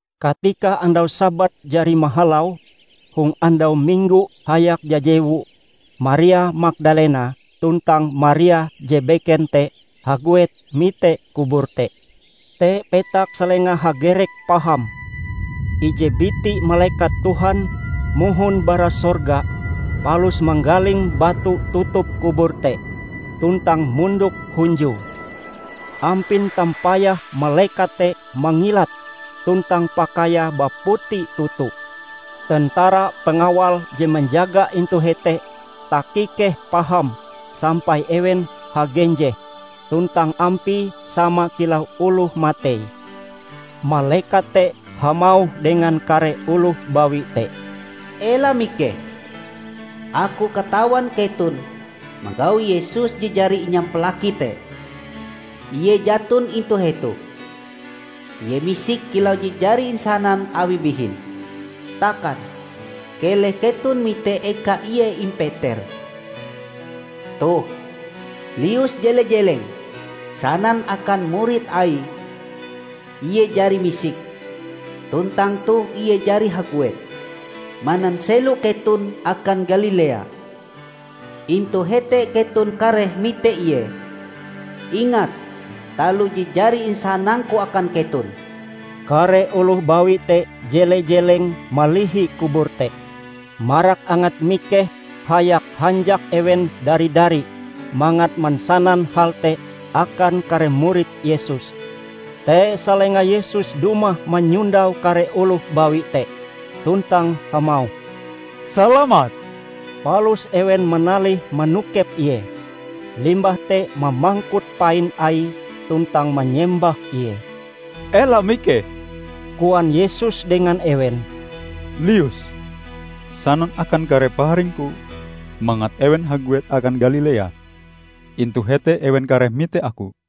Katika andau Sabat jari mahalau, hong andau Minggo hayak jajewu, Maria Magdalena tuntang Maria je beken te haguet mite kubur te. Te petak salenga hagerek paham. Ije biti malekat Tuhan mohon bara sorga palus manggaling batu tutup kubur te, tuntang mondok hunjue. Ampin tampayah malekat te mangilat, tuntang pakaiae baputi toto. Tentara pengawal je manjaga intu hete takikeh paham sampai ewen hagenjeh, tuntang ampie sama kilau oloh matei. Malekat te hamauh dengan kare oloh bawi te, "Ela mikeh! Aku katawan keton manggau Yesus je jari inyampalaki te. Ie jaton intu hetoh. Ie misik kilau je jari insanan Awie bihin. Takan, keleh keton mite eka Ie impeter. Toh, lius jele-jeleng, sanan akan murid Aie, 'Ie jari misik, tuntang toh Ie jari haguet mananselo keton akan Galilea. Intu hete keton kareh mite Ie!' Ingat taloh je jari insanangku akan keton." Kare oloh bawi te jele-jeleng malihi kubur te. Marak angat mikeh hayak hanjak ewen dari-dari mangat mansanan hal te akan kare murid Yesus. Te salenga Yesus dumah manyondau kare oloh bawi te, tuntang hamauh, "Salamat!" Palus ewen manalih manokep Ie, limbah te mamangkut pain Aie tuntang manyembah Ie. "Ela mikeh," koan Yesus dengan ewen, "lius sanan akan kare paharing-Ku mangat ewen haguet akan Galilea; intu hete ewen kareh mite Aku."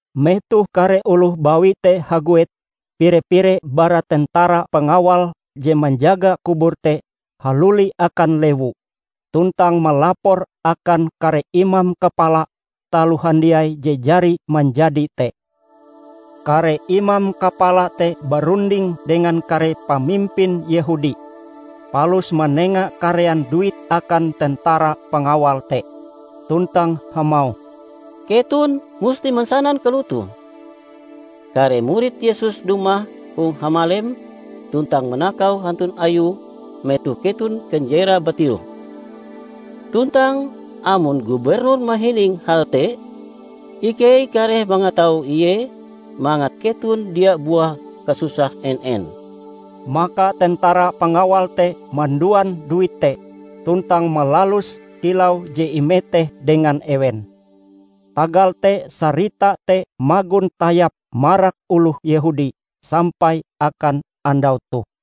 Metoh kare oloh bawi te haguet, pire-pire bara tentara pengawal je manjaga kubur te haluli akan lewu, tuntang malapor akan kare imam kapala taloh handiai je jari manjadi te. Kare imam kapala te barunding dengan kare pamimpin Yehudi, palus manenga karean duit akan tentara pangawal te, tuntang hamauh, "Keton musti mansanan kalotoh: kare murid Yesus dumah hong hamalem tuntang manakau hantun Ayue metoh keton kanjerae batiroh. Tuntang amon gubernur mahining hal te, ikei kareh mangatau Ie mangat keton dia buah kasusah en-en." Maka tentara pangawal te manduan duit te tuntang malaluse kilau je imeteh dengan ewen. Tagal te sarita te magon tayap marak oloh Yehudi sampai akan andau toh.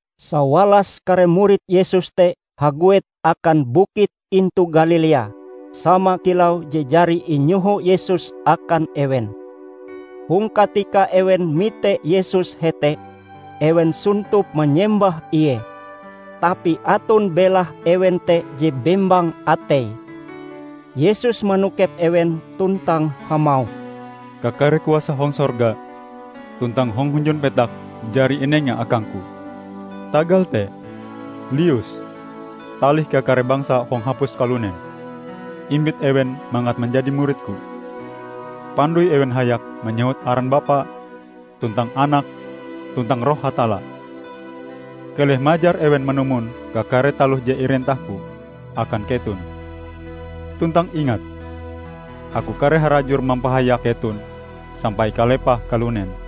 Sawalas kare murid Yesus te haguet akan bukit intu Galilea sama kilau je jari inyoho Yesus akan ewen. Hong katika ewen mite Yesus hete, ewen sontop manyembah Ie. Tapi aton belah ewen te je bembang ateie. Yesus manokep ewen tuntang hamauh, "Kakare kuasa hong sorga tuntang hong hunjun petak jari inenga akang-Ku. Tagal te lius talih kakare bangsa hong hapus kalunen, imbit ewen mangat manjadi murid-Ku. Pandoi ewen hayak manyewut aran Bapa, tuntang Anak, tuntang Roh Hatalla. Keleh majar ewen manumon kakare taloh je irentah-Ku akan keton. Tuntang ingat Aku kareh harajur mampahayak keton sampai kalepah kalunen."